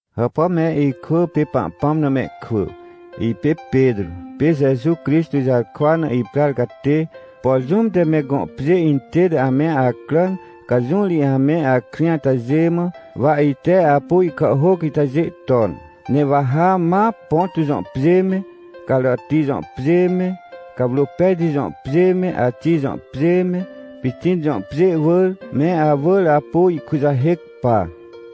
Hàpà me ikwỳ pê Pahpãm na mehkwỳ! Ipê Petrô, pê Jeju Crixtô jarkwa na iprar catê. Por jũm te me gõ pjê intête ame acràn, ca jũ ri ame akrĩ atajê mã, wa ite apu ihkàhhôc itajê ton. Ne wa ha ma Ponto jõ pjê me, Carati jõ pjê me, Cawrôpejti jõ pjê me, Axij jõ pjê me, Pitin jõ pjê wỳr, me awỳr apu ihkujahêc pa.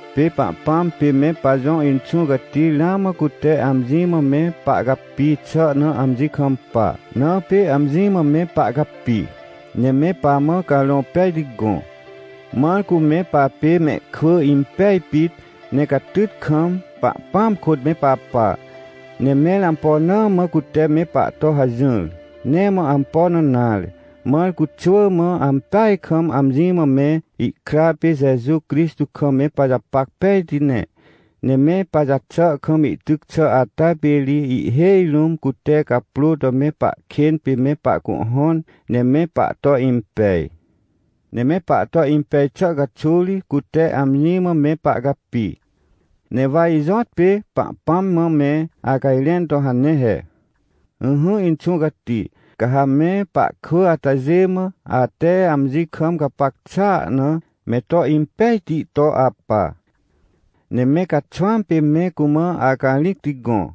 Pê Pahpãm pê me pajõ Inxũ Cati ramã cute amji mã me pahcapi xà na amji kampa. Na pê amji mã me pahcapi, ne me pamã Carõ Pejti gõ, mãr cu me papê mehkwỳ impej pit, ne catyt kam, Pahpãam kôt me papa. Ne mẽr ampo na mã cute me pahto hajỹr? Nee mã ampo na nare, mãr cu xwỳ mã ampeaj kam, amji mã me ihkra pê Jeju Crixtô kam me pajapac pejti ne. Ne me pajaxà kam ihtyc xà ata pê ri ihhêj rũm cute caprô to me pahkên pê me pahcuhhõn, ne me pahto impej. Ne me pahto impej xà caxuw ri, cute amji mã me pahcapi. Ne wa ijõtpê Pahpãm mã me acajrẽn to hane he: — Ỹhỹ, Inxũ Cati, ca ha me pahkwỳ atajê mã, ate amji kam gapac xàa na, me to impejti to apa. Ne me caxwãm pê me cumã acarĩcti gõ,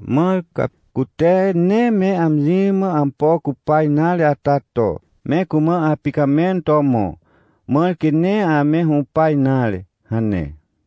mãr ca, cute nee me amji mã ampo cupa nare ata to, me cumã apicamẽn to mõ, mãr quê nee ame hũpa nare — hane.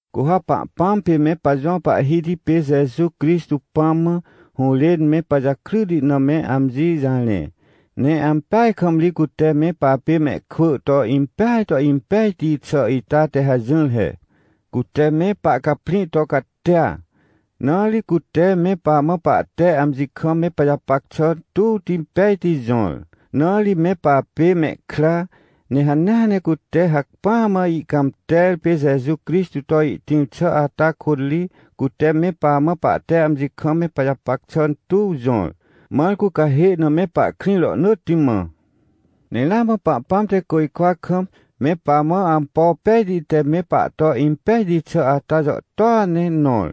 Cu ha Pahpãm pê me pajõ Pahhiti pê Jeju Crixtô Pãm mã, hũrên me pajakryti na me amji jarẽ. Ne ampeaj kam ri cute me papê mehkwỳ to impeaj to impejti xà ita te hajỹr he. Cute me pahcaprĩ to catia, na ri cute me pamã pahte amji kam me pajapac xà tuwti pejti jõr, na ri me papê mehkra. Ne hanea ne cute hacpỹa mã ihcãmter pê Jeju Crixtô to ihtĩr xà ata kôt ri, cute me pamã pahte amji kam me pajapac xà tuw jõr, mãr cu cahê na me pahkrĩ rohnỳtti mã. Ne ramã Pahpãm te côjkwa kam, me pamã ampo pejti te me pahto impejti xà ata jàhtôa ne nõr.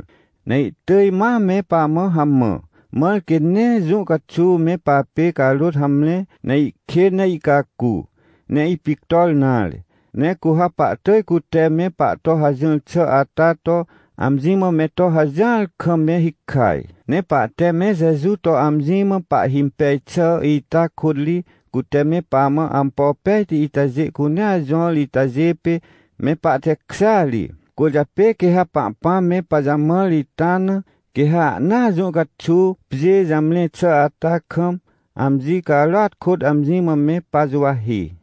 Ne ihtỳj ma me pamã hamã, mãr quê nee jũ caxuw me papê carôt hamre, ne ihkên ne ihcacu, ne ipictor nare. Ne cu ha pahtỳj cute me pahto hajỹr xà ata to, amji mã me to hajỹar kam me hikaj. Ne pahte me Jeju to amji mã pahhimpej xà ita kôt ri, cute me pamã ampo pejti itajê cunea jõr itajê pê, me pahtekjêa ri. Cwỳrjapê quê ha Pahpãm me pajamãr ita na, quê ha ahnaa jũ caxuw, pjê jamre xà ata kam, amji carôat kôt amji mã me pajuwahi.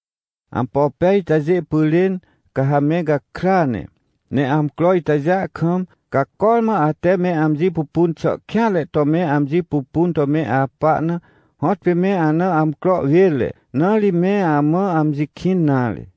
Ampo pej itajê pyrên, ca ha me gakrya ne. Ne amcro itajêa kam, ca cormã ate me amji pupun xà kêanre to me amji pupun to me apa na, hõtpê me ana amcro wênre, na ri me amã amji kĩn nare.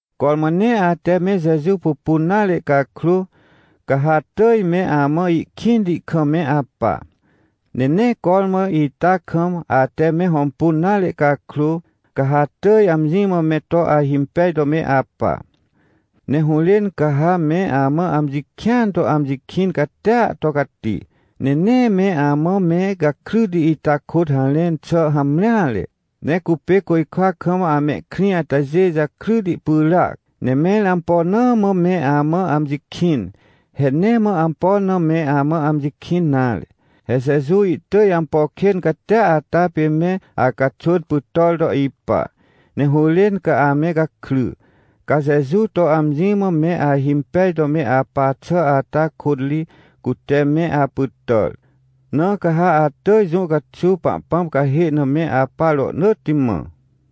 Cormã nee ate me Jeju pupun nare cakrô, ca ha atỳj me amã ihkĩnti kam me apa. Ne nee cormã ita kam, ate me hõmpun nare cakrô, ca ha atỳj amji mã me to ahimpej to me apa. Ne hũrên ca ha me amã amji kĩan to amji kĩn catia to cati, ne nee me amã me gakryti ita kôt harẽn xà hamreare, ne cupê côjkwa kam amehkrĩ atajê jakryti pyràac. Ne mẽr ampo na mã me amã amji kĩn? He nee mã ampo na me amã amji kĩn nare! He Jeju ihtỳj ampo kên catia ata pê me acaxwỳn pytàr to ipa, ne hũrên ca ame gakry. Ca Jeju to amji mã me ahimpej to me apa xà ata kôt ri, cute me apytàr, na ca ha atỳj jũ caxuw Pahpãm cahê na me apa rohnỳtti mã.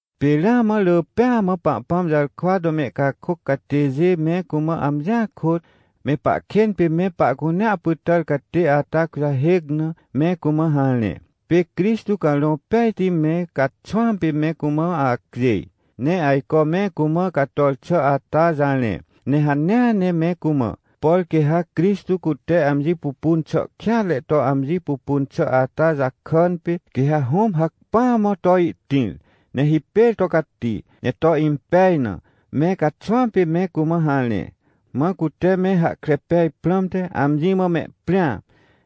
Pê ramã rỳ pêa mã Pahpãm jarkwa to mehcakôc catêjê me cumã amjia kôt, me pahkên pê me pahcunea pytàr catê ata kujahêc na, me cumã harẽ. Pê Crixtô Carõ Pejti me caxwãm pê me cumã acjêj, ne ajco me cumã cator xà ata jarẽ. Ne hanea ne me cumã, por quê ha Crixtô cute amji pupun xà kêanre to amji pupun xà ata jakàn pê, quê ha Hũm hacpỹa mã to ihtĩr, ne hipêr to cati, ne to impej na, me caxwãm pê me cumã harẽ. Mã cute me hahkre pej prãmte, amji mã mehprĩa,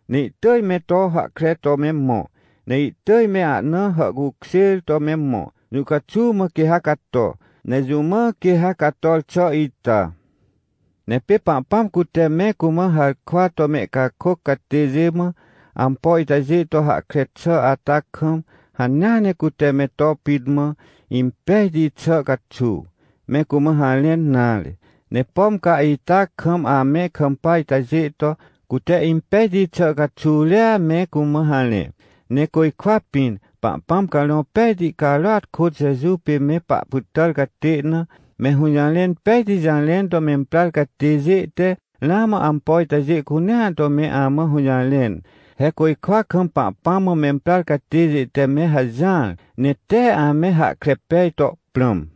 ne ihtỳj me to hahkre to me mõ. Ne ihtỳj me ahna hàhcukjêr to me mõ, jũ caxuw mã quê ha cato, ne jũ mã quê ha cator xà ita. Ne pê Pahpãm cute me cumã harkwa to mehcakôc catêjê mã, ampo itajê to hahkre xà ata kam, hanea ne cute me to pit mã, impejti xà caxuw, me cumã harẽn nare. Ne pom ca ita kam ame kampa atajê to, cute impejti xà caxuw ria me cumã harẽ. Ne côjkwa pĩn, Pahpãm Carõ Pejti carôat kôt Jeju pê me pahpytàr catê na, me hũjarẽn pejti jarẽn to memprar catêjê te, ramã ampo itajê cunea to me amã hũjarẽn. He côjkwa kam Pahpãm mã memprar catêjê te me hajỹar, ne tee ame hahkre pej to prãm.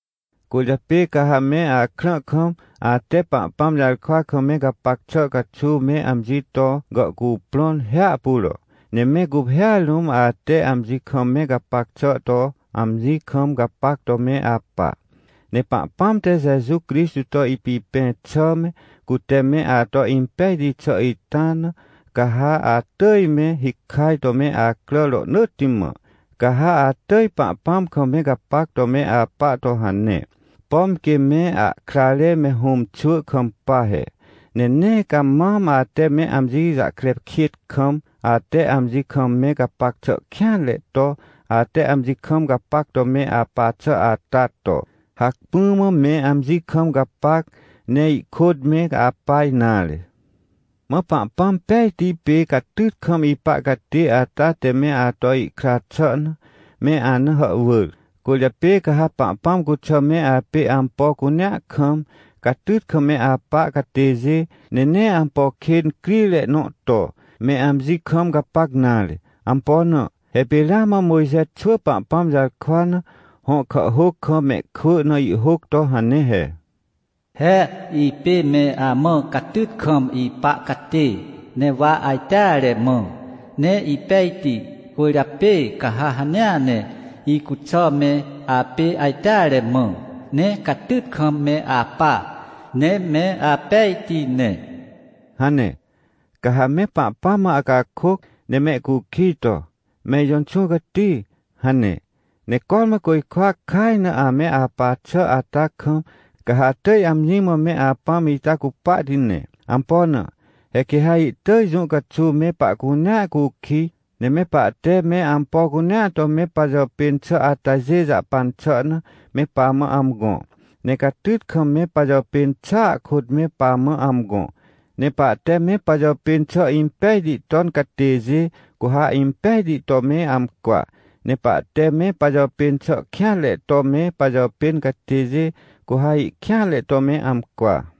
Cwỳrjapê ca ha me akrã kam, ate Pahpãm jarkwa kam me gapac xà caxuw me amji to gàhcuprõn hiahpuro, ne me guphêa rũm ate amji kam me gapac xà to amji kam gapac to me apa. Ne Pahpãm te Jeju Crixtô to ipipẽ xà me, cute me ato impejti xà ita na, ca ha atỳj me hikaj to me acrà rohnỳtti mã. Ca ha atỳj Pahpãm kam me gapac to me apa to hane, pom quê me ahkrare me hũmxwỳ kampa he. Ne nee ca mam ate me amji jahkre kêt kam, ate amji kam me gapac xà kêanre to, ate amji kam gapac to me apa xà ata to, hacpỹ mã me amji kam gapac, ne ihkôt me apa nare. Mã Pahpãm pejti pê catyt kam ipa catê ata te me ato ihkra xà na, me ana hàhwỳr. Cwỳrjapê ca ha Pahpãm cuxà me apê ampo cunea kam, catyt kam me apa catêjê, ne nee ampo kên crire nõ to, me amji kam gapac nare. Ampo na? He pê ramã Mojxe xwỳ Pahpãm jarkwa na, hõ kàhhôc kam mehkwỳ na ihhôc to hane he: “He ipê me amã catyt kam ipa catê, ne wa ajteare mã, ne ipejti. Cwỳrjapê ca ha hanea ne, icuxà me apê ajteare mã, ne catyt kam me apa, ne me apejti ne” hane. Ca ha me Pahpãm mã acakôc, ne mehcukij to: — Me ijõ Inxũ Cati — hane. Ne cormã côjkwa kaj na ame apa xà ata kam, ca ha atỳj amji mã me Apãm ita cupahti ne. Ampo na? He quê ha ihtỳj jũ caxuw me pahcunea cukij, ne me pahte me ampo cunea to me pajàpên xà atajê jahpan xà na, me pamã amgõ. Ne catyt kam me pajàpên xàa kôt me pamã amgõ. Ne pahte me pajàpên xà impejti ton catêjê, cu ha impejti to me amcwa. Ne pahte me pajàpên xà kêanre to me pajàpên catêjê, cu ha ihkêanre to me amcwa.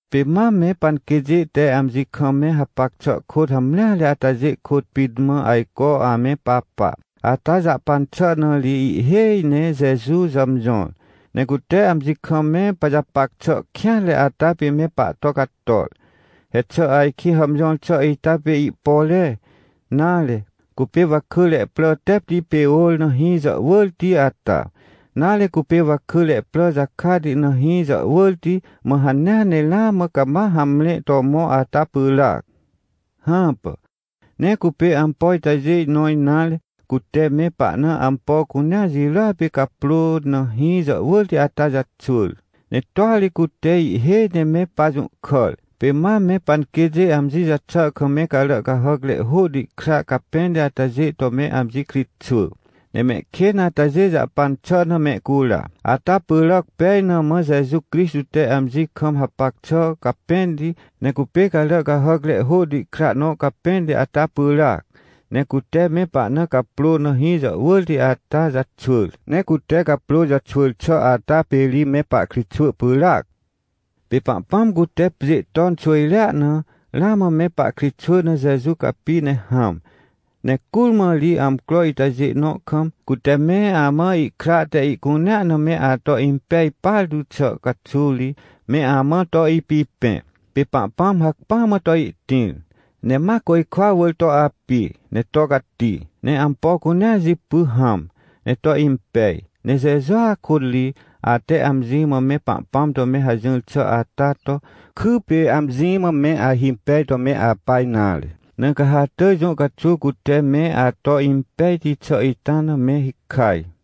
Pê mam me panquêtjê te amji kam me hapac xà kôt hamreare atajê kôt pit mã ajco ame papa. Ata jahpan xà na ri ihhêj ne Jeju jàmjõr. Ne cute amji kam me pajapac xà kêanre ata pê me pahto cator. He xà ajkĩ hàmjõr xà ita pê ihpore, nare, cupê wakỳre prà tepti pê ôr na hĩ jàhwỳrti ata? Nare cupê wakỳre prà jakati na hĩ jàhwỳrti, mã hanea ne ramã cama hamre to mõ ata pyràac? Hãpà, nee cupê ampo itajê nõ nare. Cute me pahna ampo cunea jirôa pê caprô na hĩ jàhwỳrti ata jaxwỳr, ne toa ri cute ihhêj ne me pajũhkàr. Pê mam me panquêtjê amji jaxà kam me carà cahàcre hôhti kra capẽnti atajê to me amji kritxwỳ, ne mehkên atajê jahpan xà na mehcura. Ata pyràc pej na mã Jeju Crixtô te amji kam hapac xà capẽnti, ne cupê carà cahàcre hôhti kra nõ capẽnti ata pyràac, ne cute me pahna caprô na hĩ jàhwỳrti ata jaxwỳr, ne cute caprô jaxwỳr xà ata pê ri me pahkritxwỳ pyràac. Pê Pahpãm cute pjê ton xwỳjrea na, ramã me pahkritxwỳ na Jeju capi ne hãm. Ne curmã ri amcro itajê nõ kam, cute me amã ihkra te ihcunea na me ato impej partu xà caxuw ri, me amã to ipipẽ. Pê Pahpãm hacpỹa mã to ihtĩr, ne ma côjkwa wỳr to api, ne to cati, ne ampo cunea jipy hãm, ne to impej. Ne Jejua kôt ri, ate amji mã me Pahpãm to me hajỹr xà ata to, kypê amji mã me ahimpej to me apa nare. Na ca ha atỳj jũ caxuw cute me ato impejti xà ita na, me hikaj.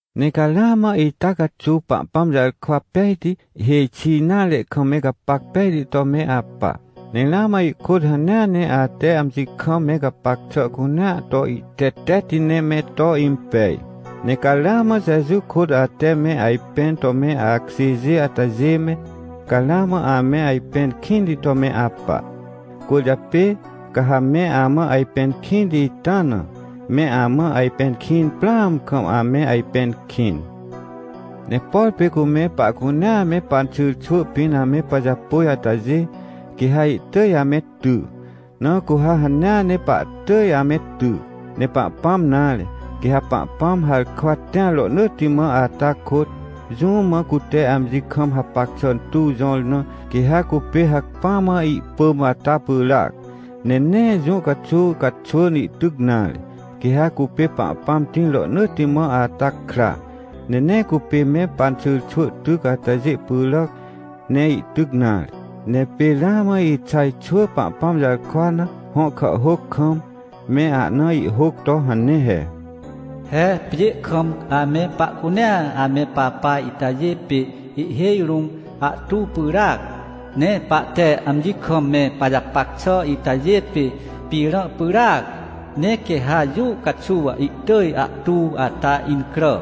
Ne ca ramã ita caxuw Pahpãm jarkwa pejti, hêj xi nare kam me gapac pejti to me apa. Ne ramã ihkôt hanea ne ate amji kam me gapac xà cunea to ihtetetti ne me to impej. Ne ca ramã Jeju kôt ate me ajpẽn to me akjêjê atajê me, ca ramã ame ajpẽn kĩnti to me apa. Cwỳrjapê, ca ha me amã ajpẽn kĩnti ita na, me amã ajpẽn kĩn prãam kam ame ajpẽn kĩn. Ne por pê cu me pahcunea me panxyrxwỳ pĩn ame pajapôj atajê, quê ha ihtỳj ame ty, na cu ha hanea ne pahtỳj ame ty. Ne Pahpãm nare. Quê ha Pahpãm harkwa tĩar rohnỳtti mã ata kôt, jũm mã cute amji kam hapac xà tuw jõr na, quê ha cupê hacpỹa mã ihpỳm ata pyràac, ne nee jũ caxuw caxwỳn ihtyc nare. Quê ha cupê Pahpãm tĩr rohnỳtti mã ata kra, ne nee cupê me panxyrxwỳ tyc atajê pyràc, ne ihtyc nare. Ne pê ramã Ixaj xwỳ Pahpãm jarkwa na, hõ kàhhôc kam, me ahna ihhôc to hane he: “He pjê kam ame pahcunea ame papa itajê pê ihhêj rũm ahtu pyràac, ne pahte amji kam me pajapac xà itajê pê pĩrã pyràac. Ne quê ha jũ caxuw ihtỳj ahtu ata incrà,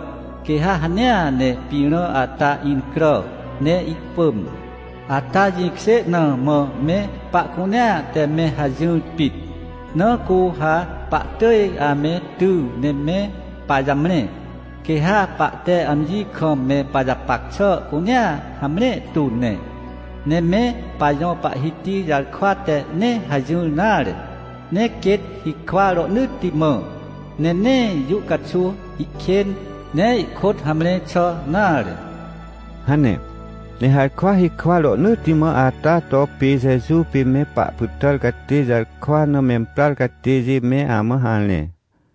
quê ha hanea ne pĩrã ata incrà, ne ihpỳm. Ata jĩkjê na mã me pahcunea te me hajỹr pit, na cu ha pahtỳj ame ty ne me pajamre, quê ha pahte amji kam me pajapac xà cunea hamre tu ne. Ne me pajõ Pahhiti jarkwa te nee hajỹr nare, ne quêt hikwa rohnỳtti mã, ne nee jũ caxuw ihkên, ne ihkôt hamre xà nare” hane. Ne harkwa hikwa rohnỳtti mã ata to pê Jeju pê me pahpytàr catê jarkwa na memprar catêjê me amã harẽ.